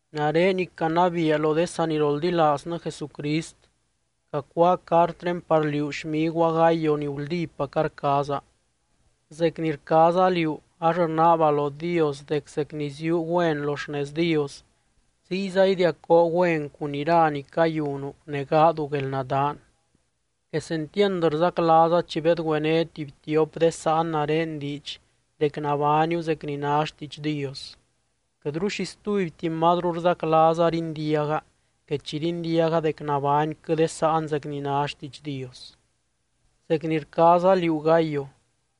Nare ni canabiia lo de saniroldilaaznɨ Jesucrist, cacuáa cartré par liú xmiguaa Gayo ni guldípaca rcaaza. Zec ni rcaaza liú, ax rnaaba lo Dios dec zec ni ziúu güen lo xnez Dios, ziyza idiacoo güen cun ira ni cayunu ne gaadu guelnadaan. Quesentiand rzaclaaza chi bedgüené tuby tiop de sáan nare diidx dec nabániu zec ni ná xtiidx Dios. Quɨtru xi stubyti mazru rzaclaaza rindiaga que chi rindiaga dec nabányquɨ de sáan zec ni ná xtiidx Dios. Zec ni rcaaza liú Gayo,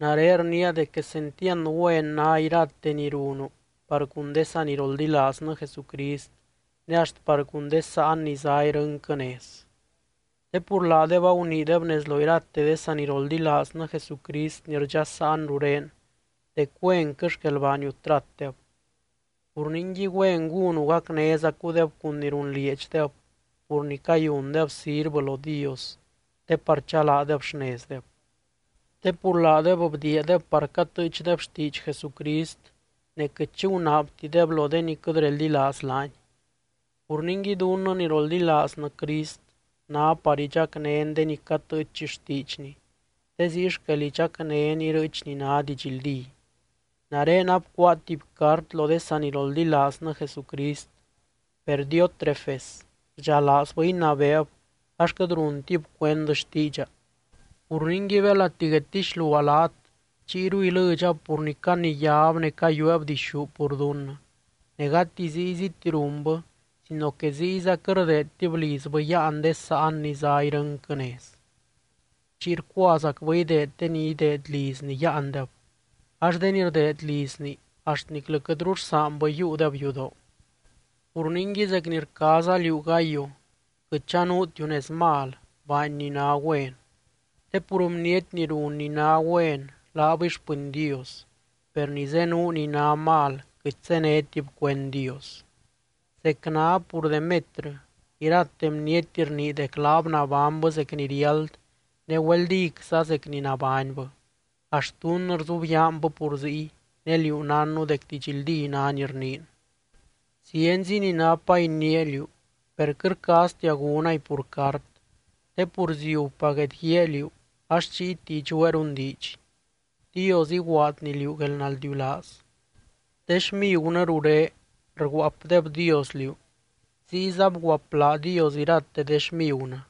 nare rniia dec quesentiand güen ná irate ni runu par cun de saniroldilaaznɨ Jesucrist, ne axt par cun de sáan ni zá irɨnquɨ nez. Te pur laadeb aguniideb nez lo irate de saniroldilaaznɨ Jesucrist ni rdxasaan ruré dec güenquɨ xquel baaniu tratdeb. Pur ningui, güen gúnu gacnézacudeb cun ni runlieedxdeb pur ni cayundeb sirvɨ lo Dios, te par chalaadeb xnezdeb. Te pur laadeb bdiiadeb par catɨɨchdeb xtiidx Jesucrist, ne quɨt xi gunaabtideb lo de ni quɨt reldilaaz laany. Pur ningui, dunnɨ ni roldilaaznɨ Crist ná par idxacnén de ni catɨɨch xtiidxny, te ziy xquel idxacnén irɨɨch ni ná didxldí. Nare abcuáa tuby cart lo de saniroldilaaznɨ Jesucrist, per Diótrefes rdxalaazbɨ inabeeb ax quɨt runtib cuend xtiidxa. Pur ningui, belati guedtixluaa laat, chiyru ilɨdxab pur ni caniyáb ne cayueeb dixú pur dunnɨ. Ne gati zíyziti runbɨ sino que ziyza quɨt rdeedtib lizbɨ yáan de sáan ni zá irɨnquɨ nez. Chiy rcuazacbɨ ideed de ni ideed lizni yáandeb, ax de ni rdeed lizni axt niclɨ quɨtru rsaanbɨ yiiudeb yudoo. Pur ningui zec ni rcaaza liú Gayo, quɨt chanuutiu nez mal, baany ni ná güen. Te pur bniety ni run ni ná güen laabɨy xpɨny Dios, per ni zenuu ni ná mal quɨt zénetib cuend Dios. Zec ná pur Demetrɨ, irate bniety rnii dec laab nabánybɨ zec ni riáld, ne güeldicza zec ni nabánybɨ. Axt dunnɨ rzubyaanbɨ pur ziy, ne liú nánnu dec didxldí ná ni rniin. Zienzi ni napa iniia liú, per quɨt rcaaztia gúnay pur cart te pur ziubpa guedguíaa liú ax chiyti idxueerun diidx. Dios iguaadny liú guelnaldiulaaz. De xmigunɨ ruré rguaapdebdios liú, ziyza bguaapladios irate de xmigunɨ.